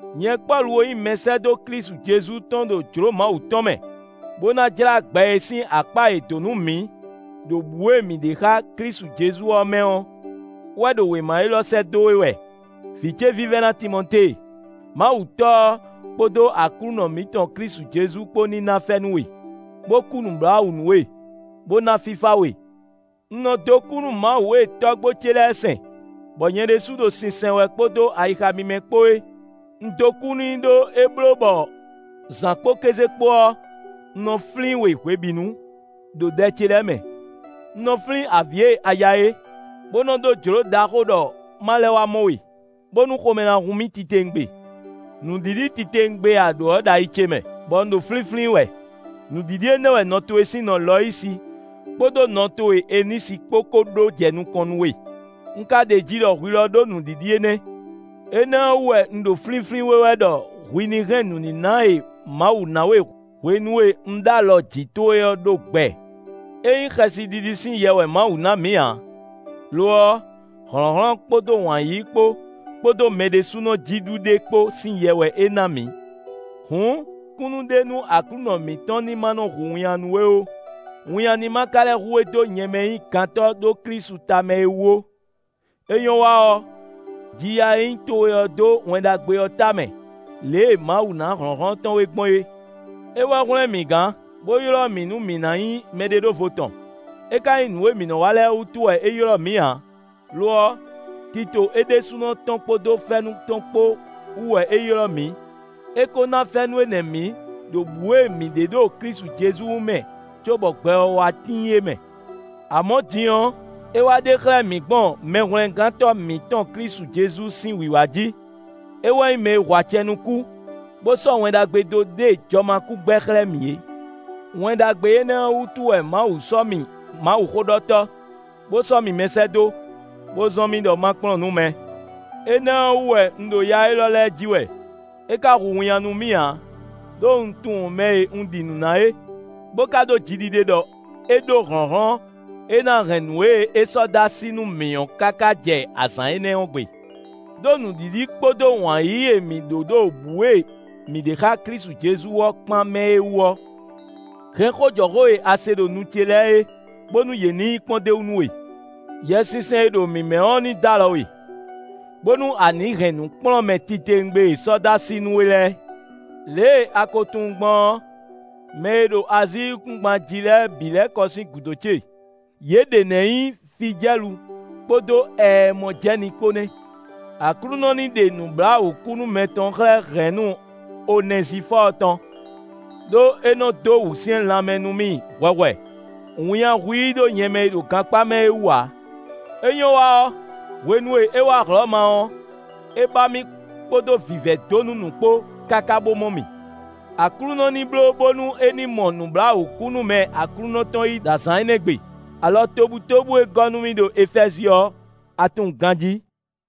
Nyɛ Pɔ́lu e nyí mɛsɛ́dó Klísu Jezu tɔn ɖo jlǒ Mawu tɔn mɛ, bó ná jlá gbɛ e sín akpá è dǒ nú mǐ ɖo bǔ e mǐ ɖe xá Klísu Jezu ɔ́ mɛ ɔ́ wɛ ɖo wěma élɔ́ sɛ́ dó we wɛ, vǐ ce vívɛ́ná Timɔtée. Mawu Tɔ́ ɔ́ kpódó Aklúnɔ mǐtɔn Klísu Jezu kpó ní ná fɛ́nú we, bó kú nǔbláwǔ nú we, bó ná fífá we. Un nɔ dó kú nú Mawu e tɔ́gbó ce lɛ́ɛ sɛn, bɔ nyɛ ɖésú ɖo sinsɛn wɛ kpódó ayixa mímɛ́ kpó é. Un dó kú n'i ɖó é bló bɔ zǎn kpó kéze kpó ɔ́, un nɔ flín we hwebǐnu, ɖo ɖɛ ce lɛ́ɛ mɛ. Un nɔ flín avǐ e a ya é, bó nɔ ɖó jlǒ ɖaxó ɖɔ ma lɛ́ wá mɔ we, bónú xomɛ ná hun mì titewungbe. Nǔɖiɖi titewungbe e a ɖǒ ɔ́ ɖo ayi ce mɛ, bɔ un ɖo flínflín wɛ. Nǔɖiɖi énɛ́ ɔ́ wɛ nɔ towe sín nɔ Lɔyisi kpódó nɔ towe Enisi kpó ko ɖó jɛ nukɔn nú we. Un ka ɖeji ɖɔ hwi lɔ ɖó nǔɖiɖi énɛ́. Énɛ́ ɔ́ wú wɛ un ɖo flínflín we wɛ ɖɔ hwi ní hɛn nǔníná e Mawu ná we hwenu e un ɖó alɔ jǐ towe ɔ́ ɖó gbɛ. Ényí xɛsiɖiɖi sín yɛ wɛ Mawu ná mǐ ǎ; lo ɔ́, hlɔ̌nhlɔ́n kpódó wǎn yíyí kpó, kpódó mɛ ɖésúnɔ jí ɖu ɖe kpó sín yɛ wɛ é ná mǐ. Hǔn kúnnu ɖe nú Aklúnɔ mǐtɔn ní má nɔ́ hu winnyá nú we ó. Winnyá ní ma ka lɛ́ hu we dó nyɛ mɛ e nyí gantɔ́ ɖó Klísu tamɛ é wú ó; é nyɔ́ wa ɔ́, ji ya e nyí towe ɔ́ dó Wɛn Ɖagbe ɔ́ tamɛ lě e Mawu ná hlɔ̌nhlɔ́n tɔn we gbɔn é. É wɛ hwlɛ́n mǐ gán, bó ylɔ́ mǐ nú mǐ ná nyí mɛɖeɖóvo tɔn; é ká nyí nǔ e mǐ nɔ wa lɛ́ɛ wútu wɛ é ylɔ́ mǐ ǎ; lo ɔ́, tito é ɖésúnɔ tɔn kpódó fɛ́nú tɔn kpó wú wɛ é ylɔ́ mǐ. É ko ná fɛ́nú énɛ́ mǐ ɖo bǔ e mǐ ɖe ɖo Klísu Jezu mɛ cóbɔ gbɛ ɔ́ wá tíin é mɛ. Amɔ̌ din ɔ́, é wá ɖe xlɛ́ mǐ gbɔn Mɛhwlɛ́ngántɔ́ mǐtɔn Klísu Jezu sín wǐwá jí. É wɛ nyí mɛ e hu acɛ nú kú, bó sɔ́ Wɛn Ɖagbe dó ɖe jɔmakúgbɛ xlɛ́ mǐ é. Wɛn Ɖagbe énɛ́ ɔ́ wútu wɛ Mawu sɔ́ mì mawuxóɖɔtɔ́, bó sɔ́ mì mɛsɛ́dó, bó zɔ́n mì ɖɔ ma kplɔ́n nǔ mɛ. Énɛ́ ɔ́ wú wɛ un ɖo ya élɔ́ lɛ́ɛ ji wɛ; é ka hu winnyá nú mì ǎ; ɖó un tunwun mɛ e un ɖi nǔ ná é, bó ka ɖó jiɖiɖe ɖɔ é ɖó hlɔ̌nhlɔ́n e ná hɛn nǔ e é sɔ́ dó así nú mǐ ɔ́ káká jɛ azǎn énɛ́ ɔ́ gbe. Đó nǔɖiɖi kpódó wǎn yíyí e mǐ ɖó ɖo bǔ e mǐ ɖe xá Klísu Jezu ɔ́ kpán mɛ é wú ɔ́, hɛn xó jɔ xó e a se ɖo nu ce lɛ́ɛ é, bónú yě ní nyí kpɔ́ndéwú nú we. Yɛsinsɛn e ɖo mǐ mɛ ɔ́ ní d'alɔ we, bónú a nǐ hɛn nǔkplɔ́nmɛ titewungbe e è sɔ́ dó así nú we lɛ́ɛ. Lě e a ko tunwun gbɔn ɔ́, mɛ e ɖo Azíi yíkúngban jí lɛ́ɛ bǐ lɛ́ kɔ sín gǔdo ce; yě ɖě nɛ́ nyí Fijɛ́lu kpódó Ɛɛmɔjɛ́ni kpó nɛ́. Aklúnɔ ní ɖe nǔbláwǔkúnúmɛ tɔn xlɛ́ hɛ̌nnu Onɛzifɔ́ɔ tɔn, ɖó é nɔ dó wǔsyɛ́n lanmɛ nú mì hwɛhwɛ; winnyá hu i ɖó nyɛ mɛ e ɖo gankpá mɛ ɔ́ wú ǎ. É nyɔ́ wa ɔ́, hwenu e é wá Hlɔ̌ma ɔ́, é ba mì kpódó vǐvɛ́ dó nú nǔ kpó káká bó mɔ mì. Aklúnɔ ní bló bónú é ní mɔ nǔbláwǔkúnúmɛ Aklúnɔ tɔn yí ɖo azǎn énɛ́ gbe. Alɔ tobutóbú e é gɔ́ nú mì ɖo Efɛ́zi ɔ́, a tunwun ganjí.